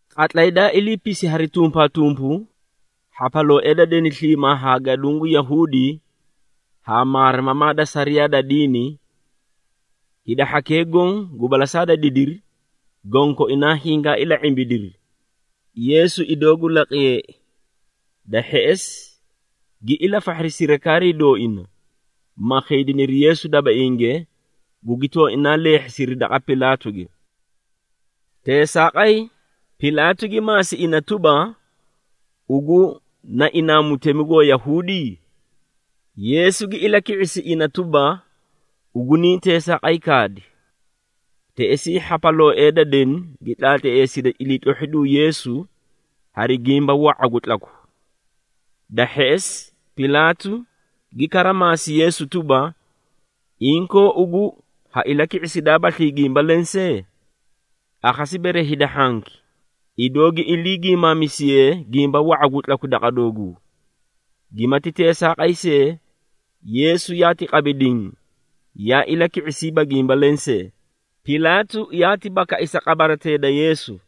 Qatlay daa iliipisi hari tumpaatumpu, hhapalooee da deni sliimaa haa gaduũ gu Yahuudi haa maarimamaa da sariyaa da diini, hida hhakee goõ gu balasaa da didiri, gonkoinaa hingaa ila⁄imbidiri, Yeesu idoo gu laqiyeei. Da hheꞌesi gi ilafahhiri sirikaarii dooina, ma khiidiniri Yeesu dabainge, gugi tooinaa leehhisiri daqa Pilaatuge. Teesaaqay, Pilaatu gi maasi ina tuba, “Ugu na inaa mutemi gu Wayahuudi?” Yeesu gi ilaki⁄isi ina tuba, “Ugu niĩ teesaaqay kaadi!” Teꞌesii hhapalooee da deni gi tlaatleesidi iliitlohhidu Yeesu hari gimba wa⁄a gu tlaku. Da hheꞌesi Pilaatu gi kara maasi Yeesu tuba, “Inkoo ugu ha ilaki⁄isidaabaslii gimba lensee? Akhasi bere hida hhanki, idoo gi ilii gimaamisiyee gimba wa⁄a gu tlaku daqa dooguu!” Gimati teesaaqay see, Yeesu yaati qabi diĩ, yaa ilaki⁄isiiba gimba lensee, Pilaatu yaati bakai sa qabaratee da Yeesu.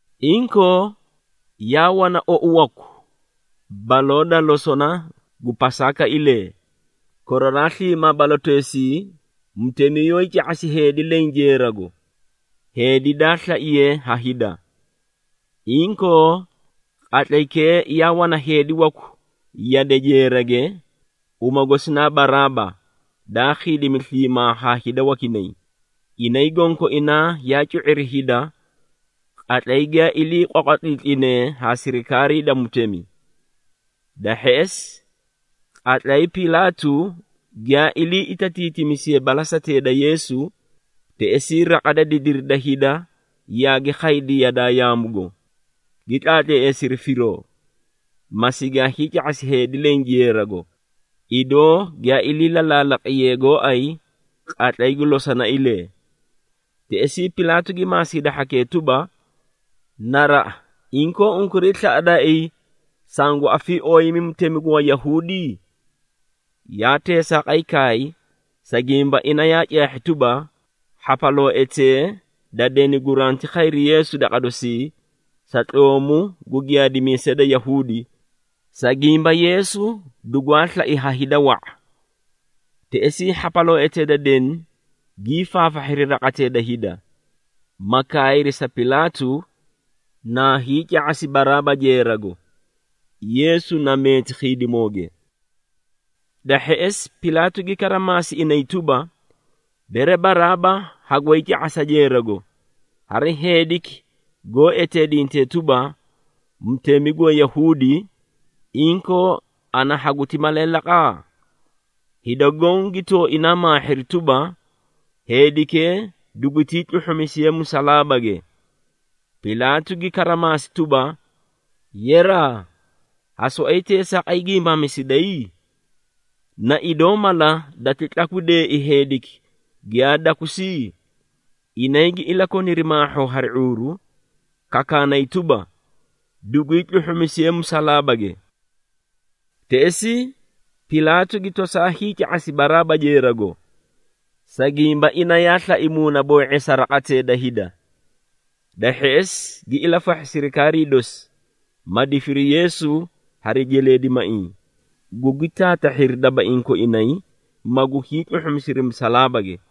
Inkoo, yaa wana ou waku baloo da losona gu Pasaakailee. Koraraa sliimaa baloteesii mutemi yoóyii ca⁄asi heedi leẽ jeerago, heedi daa slaiyee ha hida. Inkoo, qatlaykee yaa wana heedi waku yade jeerage, uma gosi naa Baraaba, daa khiidimi sliimaa haa hida wakinay, inay gonkoinaa yaa cu⁄iri hida qatlay giyaa ilii qwaqwatliitlinee haa sirikaarii da mutemi. Da hheꞌesi, qatlay Pilaatu giyaa ilii itatiitimisiye balasatee da Yeesu, teꞌesii raqa da didiri da hida yaagi khaydi yadaa yaamugo, gi tlaatleesiri firoo, ma sigaa hiica⁄asi heedi leẽ jeerago, idoo giyaa ilii lalaalaqiyee gooay qatlay gu losonailee. Teꞌesii Pilaatu gi maasi hida hhakee tuba, “Naraꞌa, inkoo unkuray slaꞌadaaii sangu afiiooyimi mutemi gu Wayahuudi?” Yaa teesaaqay kaay, sa gimba ina yaa caahhi tuba, hhapalooetee da deni guranti khayri Yeesu daqa dosii, sa tloomu gu giyaadimiisee da Yahuudi, sa gimba Yeesu dugwaa slai ha hida wa⁄a. Teꞌesii hhapalooetee da deni gii faafahhiri raqatee da hida, ma kaayri sa Pilaatu, naa hiica⁄asi Baraaba jeerago, Yeesu na meeti khiidimooge. Da hheꞌesi Pilaatu gi kara maasi inay tuba, “Bere Baraaba hagooyi ca⁄asa jeerago, hari heediki goó eteedintee tuba, mutemi gu Wayahuudi, inkoo ana haguti malee laqa?” Hida goõ gi tooinaa maahhiri tuba, “Heedikee dugutii tluhhumisiye musalaabage!” Pilaatu gi kara maasi tuba, “Yeraa, ha soꞌoyi teesaaqay giimaamisiday? Na idoo mala dati tlakwideei heediki giyaa dakusi?” Inay gi ilakoniri maahhoo hari ⁄uuru, kakaanay tuba, “Dugwii tluhhumisiye musalaabage!” Teꞌesii Pilaatu gi tosaa hiica⁄asi Baraaba jeerago, sa gimba ina yaa slai muunaboo⁄eesa raqatee da hida. Da hheꞌesi gi ilafahhi sirikaarii dosi, ma difiri Yeesu hari jeleedimaiĩ, gugi taatahhiri dabaiĩ koinay, magu hiitluhhumisiri musalaabage.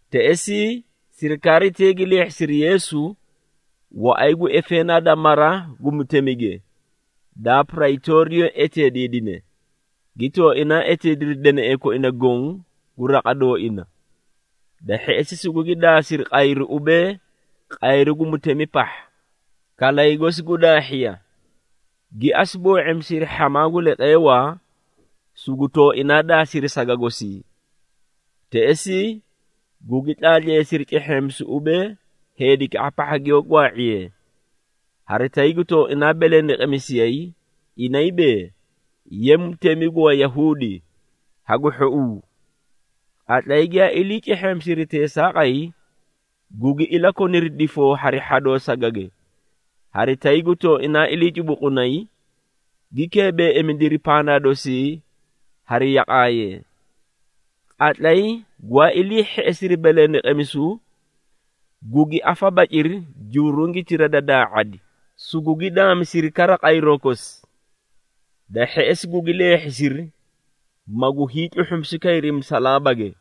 Teꞌesii sirikaaritee gi leehhisiri Yeesu waꞌay gu efeenaa da mara gu mutemige, daa Praytooriyo eteediidine, gi tooinaa eteediri deneꞌee koina goõ gu raqa dooina. Da hheꞌesi sugugi daasiri qayru ubee, qayru gu mutemi pahha, kalay gosi gu daahhiya, gi asu boo⁄imisiri hhamaa gu leqeewaa, sugu tooinaa daasiri saga gosii. Teꞌesii gugi tlaatleesiri cehheemisu ubee, heedikaꞌa pahha giyoó gwaa⁄iyee, hari tay gu tooinaa belendeqemisiyay, inay bee, “Ye mutemi gu Wayahuudi, hagu hhouu!” Qatlay giyaa ilii cehheemisiri teesaaqay, gugi ilakoniri difoo hari hhadoo sagage, hari tay gu tooinaa ilii cubuqunay, gi keebeeimidiri pandaa dosii hari yaqaayee. Qatlay gwaa ilii hheꞌesiri belendeqemisu, gugi afabaciri jurungitira da daa⁄adi, sugugi daamisiri kara qayroo kosi. Da hheꞌesi gugi leehhisiri, magu hiitluhhumisu kayri musalaabage.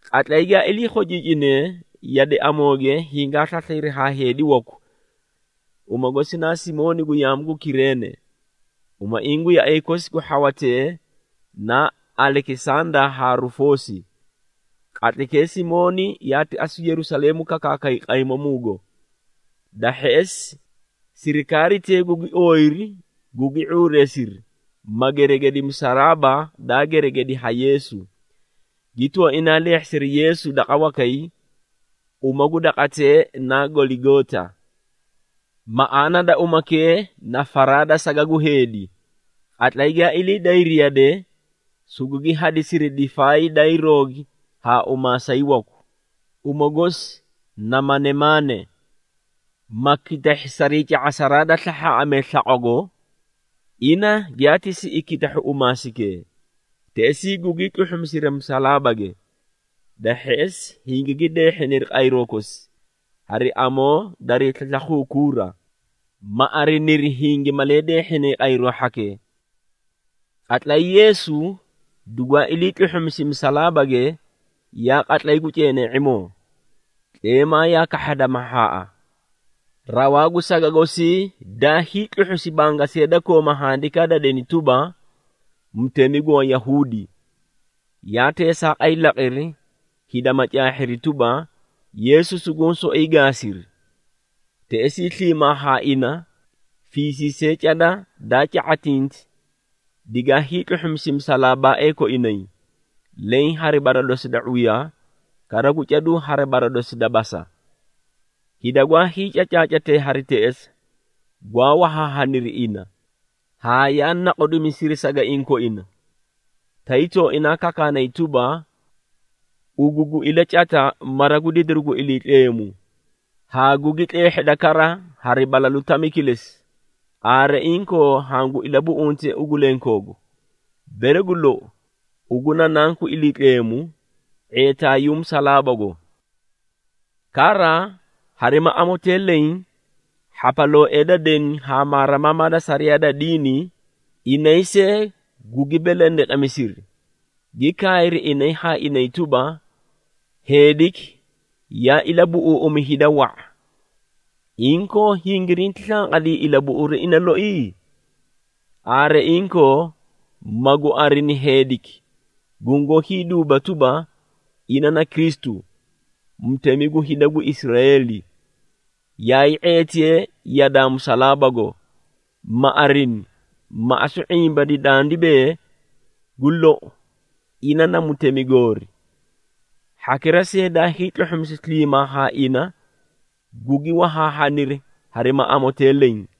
Qatlay giyaa ilii khociicinee, yade amooge hingaa slaslayri haa heedi waku, uma gosi na Simooni gu yaamu gu Kireene, umaiĩ gu yaꞌay kosi gu hhawatee naa Alekisanda haa Rufoosi. Qatlaykee Simooni yaati asu Yerusaleemu kakaakay qaymamuugo. Da hheꞌesi sirikaaritee gugi ooyiri, gugi ⁄uureesiri, ma geregedi musalaaba daa geregedi ha Yeesu, gi tooinaa leehhisiri Yeesu daqa wakay, uma gu daqatee naa Goligoota, maꞌaana da umakee na “Faraa da saga gu heedi.” Qatlay giyaa ilii dayri yade, sugugi hadisiri difaay daayii roogi haa umaasay waku, uma gosi na manemaane, ma kitahhi sarii ca⁄asaraa da slahhaaꞌamee slaqwago, ina giyaati siꞌi kitahhu umaasaykee. Teꞌesii gugii tluhhumisiri musalaabage. Da hheꞌesi hingigi deehhiniri qayroo kosi, hari amoo darii slakharaa kuura, ma ariniri hingi malee deehhinay qayroo hhakee. Qatlay Yeesu dugwaa ilii tluhhumisi musalaabage, yaa qatlay gu ceenee⁄imoo, tleemaa yaa kahhada mahhaaꞌa. Rawaa gu saga gosii daa hiitluhhusi bangasiya daa kooma handikaa da deni tuba, “MUTEMI GU WAYAHUUDI.” Yaa teesaaqay laqiri, hida ma caahhiri tuba, Yeesu suguũ soꞌoyi gaasiri. Teꞌesii sliimaa haa ina fiisiisee cada daa ca⁄atinti digaa hiitluhhumisi musalaabaaee koinay, leẽ hari bara dosi da ⁄uya, kara gu caduu hari bara dosi da basa. Hida gwaa hiicacaacatee hari teꞌesa, gwaa wahaahaniri ina, haa yaa naqudimisiri sagaiĩ koina, tay tooinaa kakaanay tuba, “Ugu gu ilacata mara gu didiru gu Iliitleemu, haa gugi tleehheda kara hari balalu tami kilesi, aare inkoo hangu ilabuꞌunte ugu lenkoogu! Bere gu lou ugu na Nanku Iliitleemu ⁄eetaayuu musalaabago.” Kara harima amotee leẽ hhapalooee da deni haa maarimamaa da sariyaa da diini, inay see gugi belendeqemisiri, gi kaayri inay haa inay tuba, “Heediki yaa ilabuꞌuuꞌumi hida wa⁄a, inkoo hingirinti slanqadii ilabuꞌuru ina loi? Aare inkoo magu arini heediki gungoó hiiduuba tuba, ina na Kristu, Mutemi gu hida gu Israeeli. Yayii ⁄eetiye yadaa musalaabago, ma arini, ma asu ⁄imbani dandi bee, gu lou, ina na mutemi goori.” Hhakira see daa hiitluhhumisi sliimaa haa ina, gugi wahaahaniri harima amotee leẽ.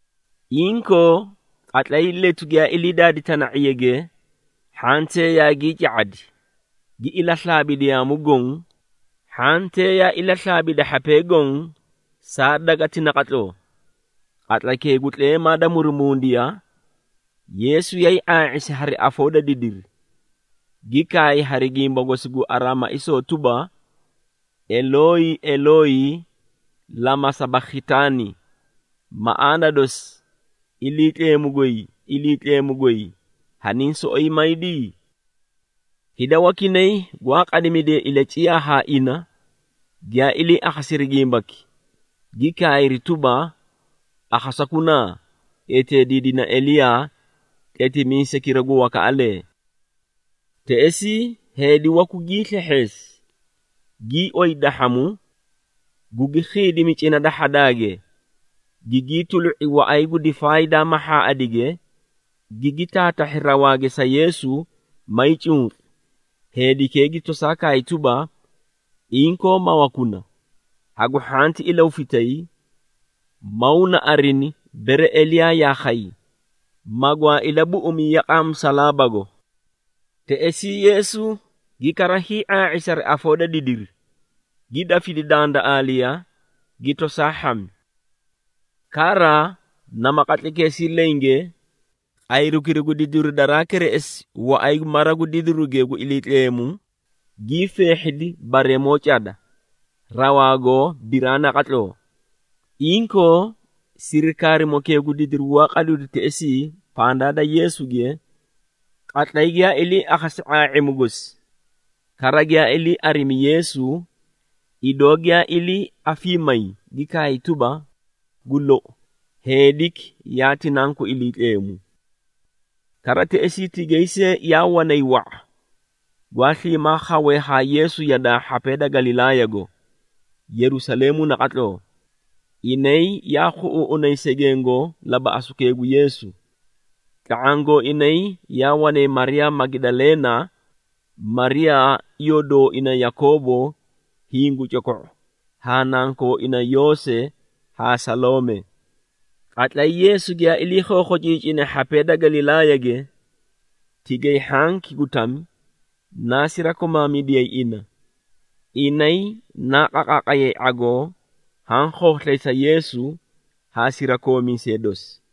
Inkoo qatlay letu giyaa ilii daadi tana⁄iyage, hhantee yaagii ca⁄adi, gi ilaslaabidi yaamu goõ, hhantee yaa ilaslaabidi hhapee goõ saa gweleti naqatloo. Qatlaykee gu tleemaa da murumundiya, Yeesu yaay ⁄aa⁄isi hari afoo da didiri, gi kaay hari gimba gosi gu Araamaisoo tuba, “Elooyi, Elooyi, lama sabakhitaani.” Maꞌaana dosi, “Iliitleemu goy, Iliitleemu goy, haniĩ soꞌoyi maydi?” Hida wakinay gwaa qadimidee ilaciyaa ha ina, giyaa ilii akhasiri gimbaki, gi kaayri tuba, “Akhasakunaa, eteediidina Eliyaa, tletimiisaykira gu wakaꞌalee.” Teꞌesii heedi waku gii slehheesi, gii oyi dahhamu, gugi khiidimi cina da hhadaage, gigii tulu⁄i waꞌay gu difaay daa mahhaaꞌadige, gigi taatahhi rawaage sa Yeesu, mayii cunqi, heedikee gi tosaa kaay tuba, “Inkoo mawakuna, hagu hhanti ilahufitay, maw na arini, bere Eliyaa yaa khay, magwaa ilabuꞌumi yaqaa musalaabago.” Teꞌesii Yeesu gi kara hii⁄aa⁄isi hari afoo da didiri, gi dafidi dandaꞌaaliya, gi tosaa hhami. Kara nama qatlaykeesii lenge, qayrukira gu didiru daraa kereꞌesi waꞌay gu mara gu didiruge gu Iliitleemu, gii feehhidi bareemoo cada, rawaago biraa naqatloo. Inkoo sirikaarimokee gu didiru gwaa qadidu teꞌesii pandaa da Yeesuge, qatlay giyaa ilii akhasi ⁄aa⁄imu gosi, kara giyaa ilii arimi Yeesu, idoo giyaa ilii afiimayi, gi kaay tuba, “Gu lou, heediki yaati Nanku Iliitleemu!” Kara teꞌesii tigay see yaa wanay wa⁄a, gwaa sliimaa khawee haa Yeesu yadaa hhapee da Galilaayago, Yerusaleemu naqatloo. Inay yaa khuꞌuuꞌunay segengo labaꞌasukee gu Yeesu. Tla⁄aã gooinay yaa wanay Mariyaa Magidaleena, Mariyaa iyoo dooina Yakoobo hiĩ gu coko⁄u haa nankooina Yoose, haa Saloome. Qatlay Yeesu giyaa ilii khookhociicine hhapee da Galilaayage, tigay hhanki gu tami, naa sirakomaamidiyay ina, inay naa qaqaaqayay ⁄agoo haã khooslay sa Yeesu haa sirakoomiisee dosi.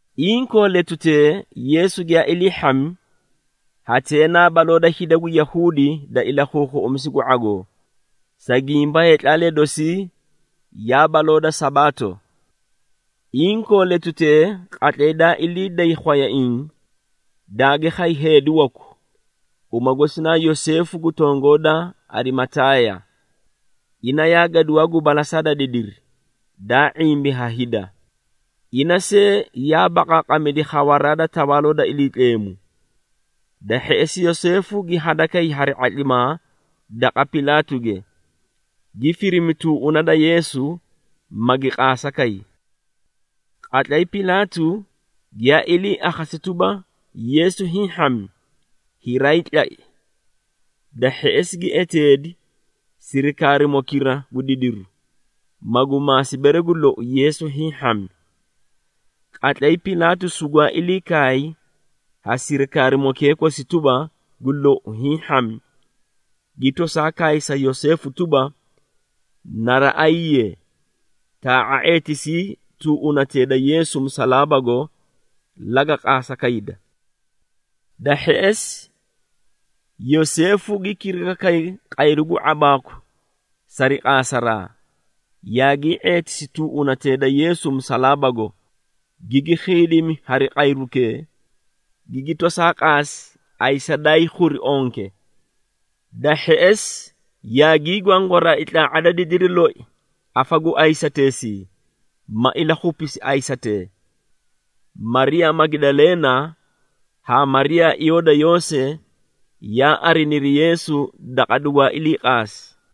Inkoo letutee, Yeesu giyaa ilii hhami, hatee naa baloo da hida gu Yahuudi da ilakhuukhuꞌumisu gu ⁄agoo, sa gimba heetlaalee dosii yaa baloo da Sabaato. Inkoo letutee qatlay daa ilii day khwayaiĩ, daagi khay heedi waku, uma gosi naa Yoseefu gu tongoo da Arimataaya. Ina yaa gaduwaa gu balasaa da didiri, daa ⁄imbi ha hida, ina see yaa baqaaqamidi khawaraa da Tawaaloo da Iliitleemu. Da hheꞌesi Yoseefu gi hadakay hari ⁄atlimaa daqa Pilaatuge, gi firimi tuuꞌuna da Yeesu, magi qaasa kay. Qatlay Pilaatu giyaa ilii akhasi tuba, Yeesu hiĩ hhami, hiraayii tlai. Da hheꞌesi gi eteedi sirikaarimokira gu didiru, magu maasi bere gu lou, Yeesu hiĩ hhami. Qatlay Pilaatu sugwaa ilii kaay ha sirikaarimokee kosi tuba, gu lou, hiĩ hhami, gi tosaa kaay sa Yoseefu tuba, “Naraꞌayiiye, taa⁄a ⁄eetisii tuuꞌunatee da Yeesu musalaabago, laga qaasa kayda.” Da hheꞌesi Yoseefu gi kiriga kay qayru gu ⁄abaaku sari qaasaraa, yaagii ⁄eetisi tuuꞌunatee da Yeesu musalaabago, gigi khiidimi hari qayrukee, gigi tosaa qaasi ayisa daayii khuri onke. Da hheꞌesi yaagii gwangwaraai tlaa⁄a da didiri loi afa gu ayisateesii, ma ilakhupisi ayisatee. Mariyaa Magidaleena haa Mariyaa iyoo da Yoose, yaa ariniri Yeesu daqa dugwaa ilii qaasi.